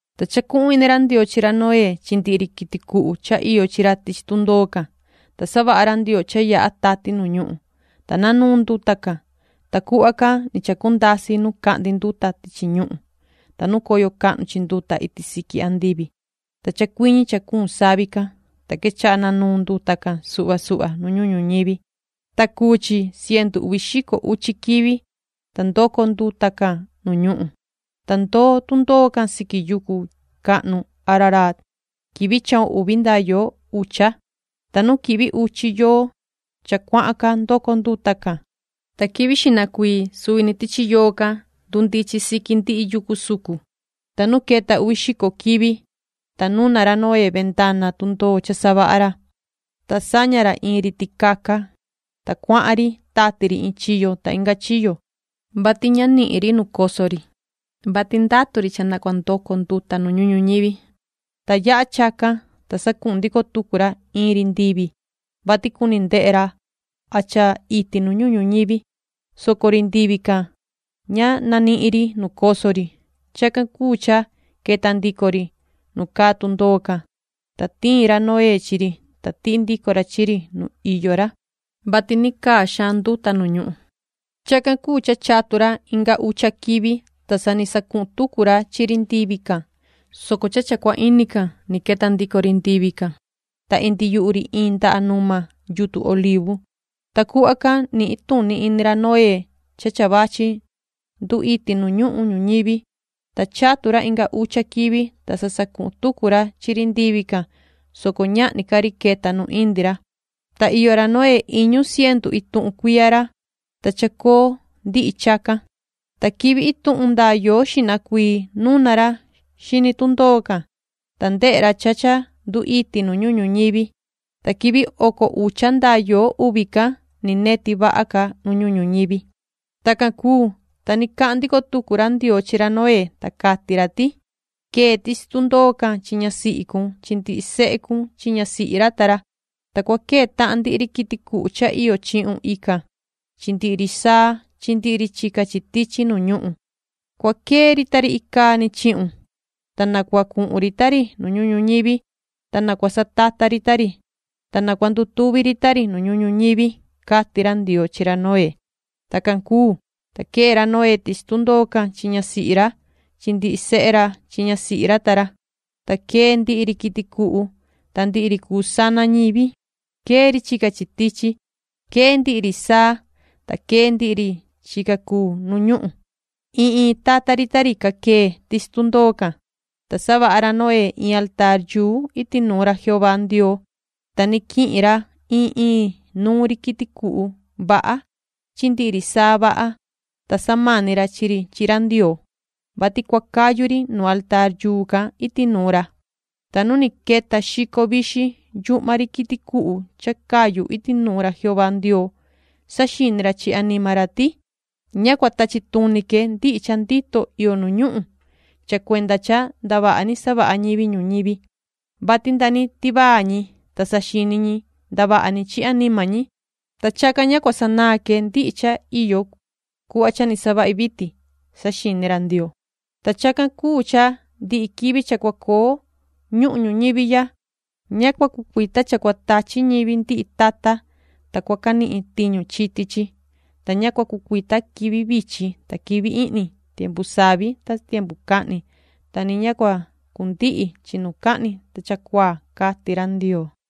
Ta chacuhun ini ra Ndioo chi ra Noé chi ndihi ri quiti cuhu cha iyo chi ra tichi tundoo can, ta savaha ra Ndioo cha yaha tati nu ñuhun, ta nanuun nduta can. Ta cuhva can ni chacundasi nu cahndi nduta tichi ñuhun, ta nu coyo cahnu chi nduta iti siqui andivi, ta chacuiñi cha cuun savi can. Ta quechaha nanuun nduta can suhva suhva nu ñuhun ñuñivi, ta cuu chi cientu uvi xico uchi quivi, ta ndoco nduta can nu ñuhun. Ta ndoo tundoo can siqui yucu cahnu Araraat quivi chahun uvi nda yoo ucha. Ta nu quihvi uchi yoo cha cuahan ca ndoco nduta can. Ta quivi xihna cuii suvi ni tichi yoo can ndundichin siqui ndihi yucu sucun. Ta nu queta uvi xico quivi, ta nuna ra Noé vendana tundoo cha savaha ra, ta saña ra iin ri ticaca, ta cuahan ri tati ri iin chiyo ta inga chiyo, vati ña nihin ri nu coso ri, vati ndatu ri cha na cua ndoco nduta nu ñuhun ñuñivi. Ta yaha chacan, ta sacuhun ndico tucu ra iin ri ndivi, vati cuni ndehe ra a cha iti nu ñuhun ñuñivi, soco ri ndivi can ña nanihin ri nu coso ri. Chacan cuu cha queta ndico ri nu caa tundoo can, ta tiin ra Noé chi ri, ta tihi ndico ra chi ri nu iyo ra, vati ni caa xaan nduta nu ñuhun. Chacan cuu cha chatu ra inga ucha quivi, ta sa ni sacuhun tucu ra chi ri ndivi can, soco cha cha cua ini can ni queta ndico ri ndivi can, ta indi yuhu ri iin ndaha numa yutun olivu, ta cuhva can nihin tuni ini ra Noé cha cha vachi ndu iti nu ñuhun ñuñivi. Ta chatu ra inga ucha quivi, ta sa sacuhun tucu ra chi ri ndivi can, soco ñahni ca ri queta nu indi ra. Ta iyo ra Noé iñu cientu ituhun cuiya ra, ta chacoo ndihi chacan. Ta quivi ituhun ndaa yoo xihna cuii nuna ra xini tundoo can, ta ndehe ra cha cha ndu iti nu ñuhun ñuñivi. Ta quivi oco ucha ndaa yoo uvi can, ni neti vaha ca nu ñuhun ñuñivi. Tacan cuu, ta ni cahan ndico tucu ra Ndioo chi ra Noé, ta cati ra ti: ”Quee tichi tundoo can chi ñasihi cun chi ndihi sehe cun chi ñasihi ra ta ra. Ta cua quee tahan ndihi ri quiti cuhu cha iyo chihun ican chi ndihi ri saa chi ndihi ri chica chi tichi nu ñuhun. Cua quee ri ta ri icaa ni chihun, ta na cua cuhun ri ta ri nu ñuhun ñuñivi, ta na cua satata ri ta ri, ta na cua ndutuvi ri ta ri nu ñuhun ñuñivi”, cati ra Ndioo chi ra Noé. Tacan cuu, ta quee ra Noé tichi tundoo can chi ñasihi ra chi ndihi sehe ra chi ñasihi ra ta ra. Ta quee ndihi ri quiti cuhu ta ndihi ri cuu sana ñivi, quee ri chica chi tichi, quee ndihi ri saa, ta quee ndihi ri chica cuu nu ñuhun, iin iin tata ri ta ri ca quee tichi tundoo can. Ta savaha ra Noé in altaar iti nuun ra Jehová Ndioo, ta ni quihin ra in in nuun ri quiti cuhu vaha chi ndihi ri saa vaha, ta samani ra chi ri chi ra Ndioo, vati cua cayu ri nu altaar can iti nuun ra. Ta nu ni queta xico vixin yuhma ri quiti cuhu cha cayu iti nuun ra Jehová Ndioo, saxini ra chi anima ra ti: “Ña cua tachi tuni que ndihi cha ndito iyo nu ñuhun cha cuenda cha ndavaha ni savaha ñivi ñuñivi, vati nda ni tivaa ñi, ta saxini ñi ndavaha ni chi anima ñi, ta chacan ña cua sanaan que ndihi cha iyo cuhva cha ni savahi vitin”, saxini ra Ndioo. “Ta chacan cuu cha ndihi quivi cha cua coo ñuhun ñuñivi ya, ña cua cucuita cha cua tachi ñivi ndihi tata, ta cua canihin tiñu chiti chi, ta ña cua cucuita quivi vichin ta quivi ihni, tiempu savi ta tiempu cahni, ta ni ña cua cundihi chinucahni ta chacuaa”, cati ra Ndioo.